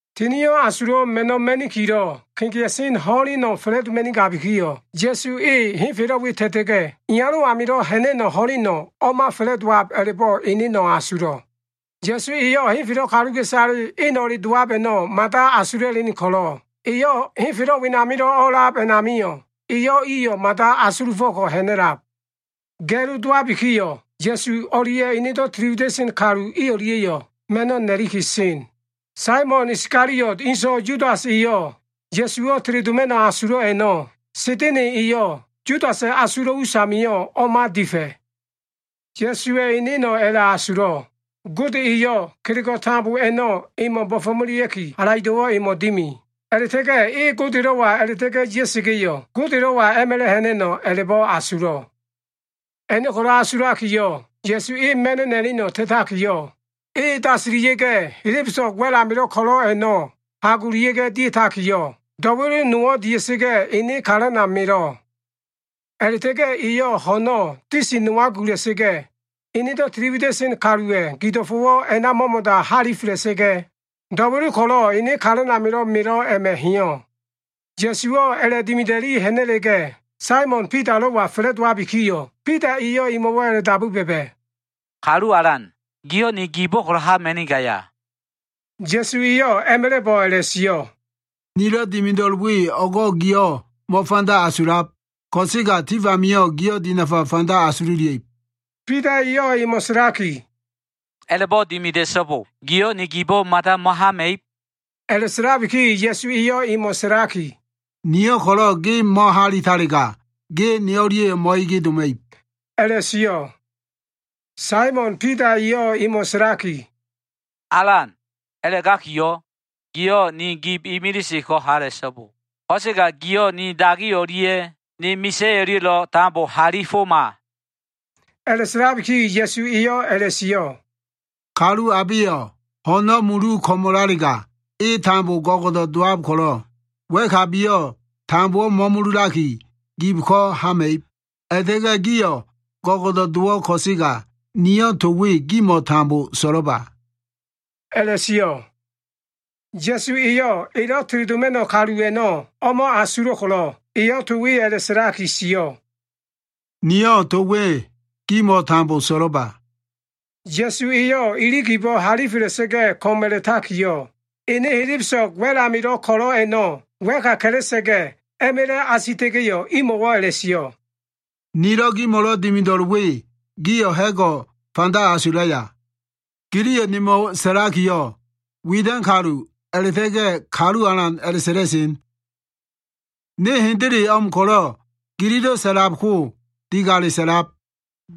Tinio꞉ Asulo꞉ Ma꞉no꞉ ma꞉nikilo꞉ kegea꞉sen ho꞉leno꞉ fa꞉la꞉doma꞉nigabikiyo꞉, Ya꞉su e henfelo꞉ we ta꞉ta꞉ga꞉, Iyalo꞉ amilo꞉ ha꞉na꞉no꞉ ho꞉leno꞉ o꞉ma fa꞉la꞉dowab a꞉la꞉bo꞉ eneno꞉ asulo꞉. Ya꞉su eyo꞉ henfelo꞉ kaluka꞉isale eno꞉le dowab a꞉no꞉ mada asula꞉len ko꞉lo꞉, eyo꞉ henfelo꞉ wilo꞉ o꞉a꞉lab a꞉namio꞉, eyo꞉ iyo꞉ mada o꞉asulufo꞉ko꞉ ha꞉na꞉lab. Ga꞉lo dowabikiyo꞉, Ya꞉su o꞉lia꞉ enedo꞉ tiliwida꞉sen kalu i o꞉lia꞉yo꞉ ma꞉no꞉ na꞉liki sen. Saimon Iskaliota꞉ inso꞉ Yudas eyo꞉ Ya꞉suwo꞉ teledoma꞉no꞉ asulo꞉ a꞉no꞉ Sa꞉da꞉na꞉ eyo꞉ Yudasa꞉ asulo꞉ usamio꞉ o꞉ma difa꞉. Ya꞉suwa꞉ eneno꞉ a꞉la꞉asulo꞉. Gode eyo꞉ kelego꞉ tambo a꞉no꞉ emo꞉ bo꞉fo꞉melea꞉ki, halaido꞉wo꞉ emo꞉ dimi. A꞉la꞉ta꞉ga꞉ e Godelo꞉wa a꞉la꞉ta꞉ga꞉ ya꞉sa꞉ga꞉yo꞉, Godelo꞉wa a꞉ma꞉la꞉ ha꞉na꞉no꞉ a꞉la꞉bo꞉ asulo꞉. A꞉no꞉ ko꞉lo꞉ asulakiyo꞉, Ya꞉su e ma꞉no꞉ na꞉leno꞉ ta꞉takiyo꞉, e dasila꞉sa꞉ga꞉ helebeso꞉g wa꞉l amilo꞉ ko꞉lo꞉ a꞉no꞉ hagolia꞉ga꞉ dia꞉takiyo꞉, do꞉welo nowo꞉ dia꞉sa꞉ga꞉ ene kalana melo꞉. A꞉la꞉ta꞉ga꞉ eyo꞉ ho꞉no꞉ disi nowa gula꞉sa꞉ga꞉, enedo꞉ tiliwida꞉sen kaluwa꞉ gido꞉fo꞉wo꞉ a꞉na mo꞉mo꞉da halifela꞉sa꞉ga꞉, do꞉welo ko꞉lo꞉ ene kalan amilo꞉ melo꞉ a꞉ma꞉ heyo꞉. Ya꞉suwa꞉yo꞉ a꞉la꞉dimida꞉li ha꞉na꞉la꞉ga꞉, Saimon Bidalo꞉wa fa꞉la꞉dowabikiyo꞉, Bida eyo꞉ emo꞉wo꞉ a꞉la꞉dabu ba꞉ba꞉, “Kalu Alan, giyo꞉ ni gibo꞉ hama꞉nigaya?” Ya꞉su eyo꞉ a꞉ma꞉la꞉bo꞉ a꞉la꞉sio꞉, “Nilo꞉ dimido꞉l we, o꞉go꞉ giyo꞉ mo꞉fanda asulab. Ko꞉sega tif amio꞉ giyo꞉ dinafa fanda asululia꞉ib.” Bida eyo꞉ emo꞉ sa꞉laki, “A꞉la꞉bo꞉ dimida꞉so꞉bo! Giyo꞉ ni gibo꞉ mada mo꞉hama꞉ib.” A꞉la꞉sa꞉labiki Ya꞉su eyo꞉ emo꞉ sa꞉laki, “Niyo꞉ ko꞉lo꞉ ge mo꞉halitalega, ge ne o꞉lia꞉yo꞉ mo꞉ege doma꞉ib,” a꞉la꞉sio꞉. Saimon Bida eyo꞉ emo꞉ sa꞉laki, “Alan, a꞉la꞉gakiyo꞉, giyo꞉ ni gib imilise ko꞉ hala꞉so꞉bo. Ko꞉sega giyo꞉ ni dagi o꞉lia꞉ ni misa꞉ o꞉lia꞉yo꞉lo꞉ tambo halifoma.” A꞉la꞉sa꞉labiki Ya꞉su eyo꞉ a꞉la꞉sio꞉, “Kalu abeyo꞉ ho꞉no꞉ mulu ko꞉mo꞉lalega, e tambo go꞉go꞉do꞉ dowab ko꞉lo꞉, wa꞉kabiyo꞉ tambo mo꞉mululaki, gib ko꞉ hama꞉ib. A꞉la꞉ta꞉ga꞉ gio꞉ go꞉go꞉do꞉ dowo꞉ ko꞉sega, niyo꞉ to we gimo꞉ tambo so꞉lo꞉ba” a꞉la꞉sio꞉. Ya꞉su eyo꞉ elo꞉ teledoma꞉no꞉ kalu a꞉no꞉ o꞉ma asulo꞉ ko꞉lo꞉, eyo꞉ to we a꞉la꞉sa꞉laki sio꞉, “Niyo꞉ to we gimo꞉ tambo so꞉lo꞉ba.” Ya꞉su eyo꞉ ili gibo꞉ halifela꞉sa꞉ga꞉ ko꞉m a꞉la꞉takiyo꞉, ene helebeso꞉g wa꞉l amilo꞉ ko꞉lo꞉ a꞉no꞉ wa꞉ka ka꞉la꞉sa꞉ga꞉, a꞉ma꞉la꞉ asita꞉ga꞉yo꞉, imo꞉wo꞉ a꞉la꞉sio꞉, “Nilo꞉ gimo꞉lo꞉ dimido꞉l we, gio꞉ ha꞉go꞉ fanda asulaya? Giliyo꞉ nemo꞉ sa꞉lakiyo꞉, ‘Widan kalu’ a꞉la꞉ta꞉ga꞉ ‘Kalu Alan’ a꞉la꞉sa꞉la꞉sen. Ne hendele o꞉m ko꞉lo꞉ gililo꞉ sa꞉lab ko digale sa꞉lab.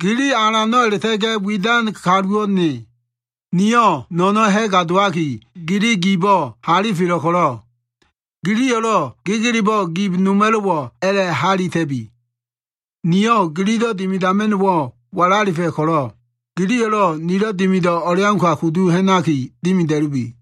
Gili Alano꞉ a꞉la꞉ta꞉ga꞉ widan kaluwo꞉ ne. Niyo꞉ no꞉no꞉no꞉ ha꞉ga dowaki, gili gibo꞉ halifelo꞉ ko꞉lo꞉, giliyo꞉lo꞉ gegelebo꞉ gib noma꞉lo꞉wo꞉ a꞉la꞉halita꞉bi. Niyo꞉ gililo꞉ dimidama꞉no꞉wo꞉ walalifa꞉ ko꞉lo꞉, giliyo꞉lo꞉ nilo꞉ dimido꞉ o꞉leauka kudu ha꞉naki dimida꞉lubi.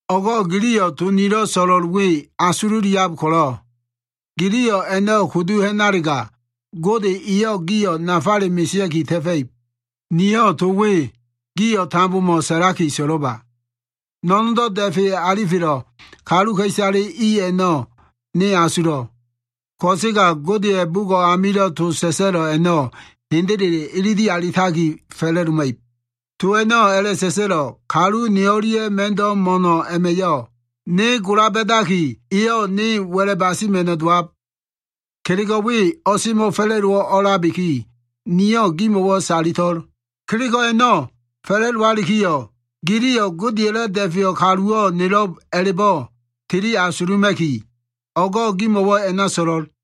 O꞉go꞉ giliyo꞉ to nilo꞉ so꞉lo꞉l we asululiab ko꞉lo꞉, giliyo꞉ a꞉no꞉ kudu ha꞉nalega, Gode eyo꞉ gio꞉ nafale mesea꞉ki ta꞉fa꞉ib. “Niyo꞉ to we gio꞉ tambomo꞉ sa꞉laki so꞉lo꞉ba. No꞉no꞉ndo꞉ da꞉fe alifelo꞉ kaluka꞉isale i a꞉no꞉ ne asulo꞉. Ko꞉sega Godeya꞉ bugo꞉ amilo꞉ to sa꞉sa꞉lo꞉ a꞉no꞉ hendele ilili alitaki fa꞉la꞉doma꞉ib. To a꞉no꞉ a꞉la꞉sa꞉sa꞉lo꞉, ‘Kalu ne o꞉lia꞉lo꞉ ma꞉ndo꞉ mo꞉no꞉ a꞉ma꞉yo꞉, ne gola ba꞉daki eyo꞉ ne wa꞉la basima꞉no꞉ dowab.’ Kelego꞉ we semo꞉fa꞉la꞉dowo꞉ o꞉a꞉labiki, niyo꞉ gimo꞉wo꞉ salito꞉l. Kelego꞉ a꞉no꞉ fa꞉la꞉dowalikiyo꞉ giliyo꞉ Godeya꞉lo꞉ Da꞉feyo꞉ kaluwo꞉ nelo꞉b a꞉la꞉bo꞉ tili asuluma꞉ki, o꞉go꞉ gimo꞉wo꞉ a꞉na so꞉lo꞉l.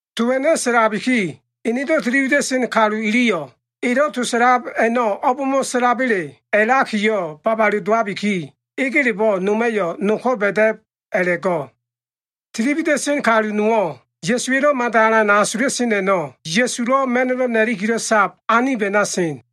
To a꞉no꞉ sa꞉labiki, enedo꞉ tili wida꞉sen kalu iliyo꞉ elo꞉ to sa꞉lab a꞉no꞉ o꞉bmo꞉ sa꞉laba꞉le a꞉lakiyo꞉ babale dowabiki, egelebo꞉ noma꞉yo꞉ no ko꞉ ba꞉da꞉b a꞉la꞉go꞉. Tili wida꞉sen kalu nowo꞉, Ya꞉suwa꞉lo꞉ mada alan asula꞉sen a꞉no꞉, Ya꞉sulo꞉ ma꞉no꞉ na꞉likilo꞉ sab anib a꞉na sen.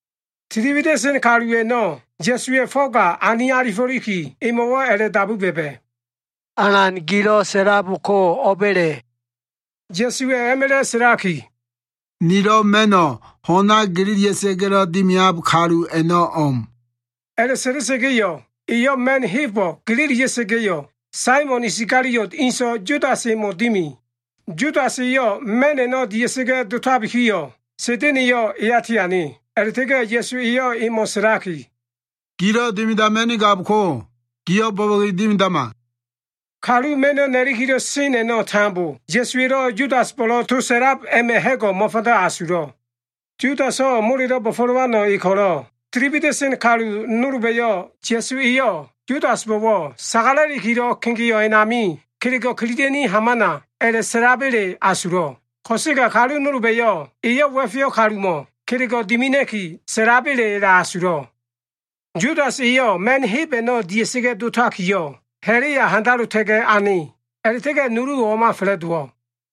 Tili wida꞉sen kalu a꞉no꞉ Ya꞉suwa꞉ fo꞉ga ani alifo꞉liki, emo꞉wo꞉ a꞉la꞉dabu ba꞉ba꞉, “Alan, gilo꞉ sa꞉lab ko o꞉ba꞉le?” Ya꞉suwa꞉ a꞉ma꞉la꞉ sa꞉laki, “Nilo꞉ ma꞉no꞉ ho꞉na gelelia꞉sa꞉ga꞉lo꞉ dimiab kalu a꞉no꞉ o꞉m.” A꞉la꞉sa꞉la꞉sa꞉ga꞉yo꞉, eyo꞉ ma꞉n hebo꞉ gelelia꞉sa꞉ga꞉yo꞉, Saimon Iskaliota꞉ inso꞉ Yudas emo꞉ dimi. Yudas eyo꞉ ma꞉n a꞉no꞉ dia꞉sa꞉ga꞉ dowabikiyo꞉, Sa꞉da꞉na꞉yo꞉ eya tiane. A꞉la꞉ta꞉ga꞉ Ya꞉su eyo꞉ emo꞉ sa꞉laki, “Gilo꞉ dimidama꞉nigab ko꞉, giyo꞉ bo꞉bo꞉ge dimidama.” Kalu ma꞉no꞉ nakilo꞉ sen a꞉no꞉ tambo, Ya꞉suwa꞉lo꞉ Yudasbo꞉lo꞉ to sa꞉lab a꞉ma꞉ ha꞉go꞉ mo꞉fanda asulo꞉. Yudaso꞉ molelo꞉ bo꞉fo꞉lowano꞉ e ko꞉lo꞉, tili wida꞉sen kalu nolba꞉yo꞉ Ya꞉su eyo꞉ Yudasbo꞉wo꞉, “Sagalakilo꞉ kegeo꞉ a꞉nami kelego꞉ kililia꞉ni hamana” a꞉la꞉sa꞉laba꞉le asulo꞉. Ko꞉sega kalu nolba꞉yo꞉ eyo꞉ wa꞉feyo꞉ kalumo꞉ kelego꞉ dimina꞉ki sa꞉laba꞉le a꞉la꞉asulo꞉. Yudas e ma꞉n heb a꞉no꞉ dia꞉sa꞉ga꞉ dotakiyo꞉, ha꞉la꞉ya handalota꞉ga꞉ ane. A꞉la꞉ta꞉ga꞉ nuluwo꞉ o꞉ma fa꞉la꞉dowo꞉.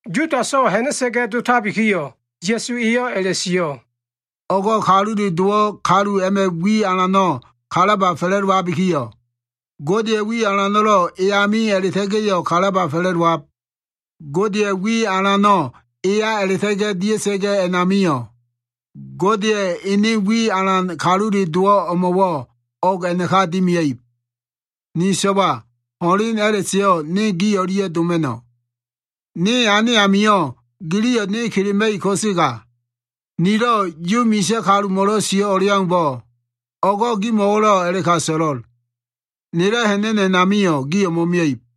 Yudaso꞉ ha꞉na꞉sa꞉ga꞉ dotabikiyo꞉, Ya꞉su eyo꞉ a꞉la꞉sio꞉, “O꞉go꞉ Kalule Dowo꞉ kalu a꞉ma꞉ wi alano꞉ kalaba fa꞉la꞉dowabikiyo꞉, Godeya꞉ wi alano꞉lo꞉ e ami a꞉la꞉ta꞉ga꞉yo꞉ kalaba fa꞉la꞉dowab. Godeyo꞉ wi alano꞉ eya a꞉la꞉ta꞉ga꞉ dia꞉sa꞉ga꞉ a꞉namio꞉, Godeya꞉ ene wi alano꞉ Kalule Dowo꞉ emo꞉wo꞉ o꞉g a꞉naka dimia꞉ib. Ni so꞉wa, ho꞉len a꞉la꞉seyo꞉ ne gi o꞉lia꞉ doma꞉no꞉. Ne ane amio꞉ giliyo꞉ ne kelema꞉ib ko꞉sega, nilo꞉ Yu misa꞉ kalumo꞉lo꞉ sio꞉ o꞉leaumbo꞉, o꞉go꞉ gimo꞉wo꞉lo꞉ a꞉la꞉ka so꞉lo꞉l. Nelo꞉ ha꞉na꞉no꞉ a꞉namio꞉, gio꞉ mo꞉mia꞉ib.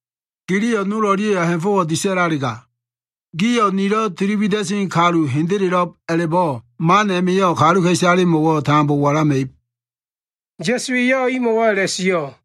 Giliyo꞉ nol o꞉lia꞉yo꞉ ha꞉fo꞉wo꞉ disa꞉lalega, gio꞉ nilo꞉ tili wida꞉sen kalu hendelelo꞉b a꞉la꞉bo꞉ man a꞉ma꞉yo꞉ kaluka꞉isalemo꞉wo꞉ tambo walama꞉ib.” Ya꞉su eyo꞉ imo꞉wo꞉ a꞉la꞉sio꞉.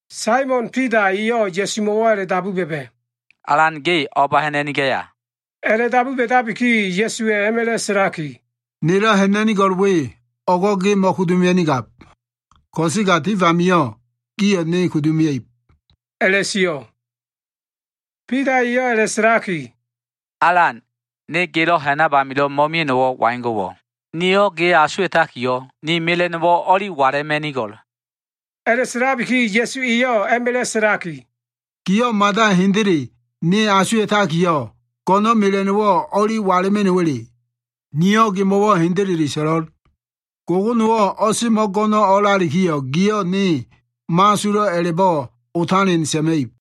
Saimon Bida eyo꞉ Ya꞉sumo꞉wo꞉ a꞉la꞉dabu ba꞉ba꞉, “Alan ge o꞉ba ha꞉na꞉nigaya?” A꞉la꞉dabu ba꞉dabiki Ya꞉suwa꞉ a꞉ma꞉la꞉ sa꞉laki, “Nelo꞉ ha꞉na꞉nigo꞉l we, o꞉go꞉ ge mo꞉kudu mia꞉nigab. Ko꞉sega tif amio꞉ gio꞉ ne kudu mia꞉ib” a꞉la꞉sio꞉. Bida eyo꞉ a꞉la꞉sa꞉laki, “Alan, ne gelo꞉ ha꞉nab amilo꞉ mo꞉mia꞉no꞉wo꞉ waigo꞉wo꞉? Niyo꞉ ge asuwa꞉takiyo꞉, ni mela꞉no꞉wo꞉ o꞉li wala꞉ma꞉nigo꞉l.” A꞉la꞉sa꞉labiki Ya꞉su eyo꞉ a꞉ma꞉la꞉ sa꞉laki, “Giyo꞉ mada hendele ne asuwa꞉takiyo꞉, go꞉no꞉n mela꞉no꞉wo꞉ o꞉li wala꞉ma꞉no꞉wa꞉le? Niyo꞉ gemo꞉wo꞉ hendele so꞉lo꞉l. Gogonowo꞉ o꞉semo꞉ go꞉no꞉ o꞉lalikiyo꞉, giyo꞉ ne mo꞉asulo꞉ a꞉la꞉bo꞉ otalen sa꞉ma꞉ib.”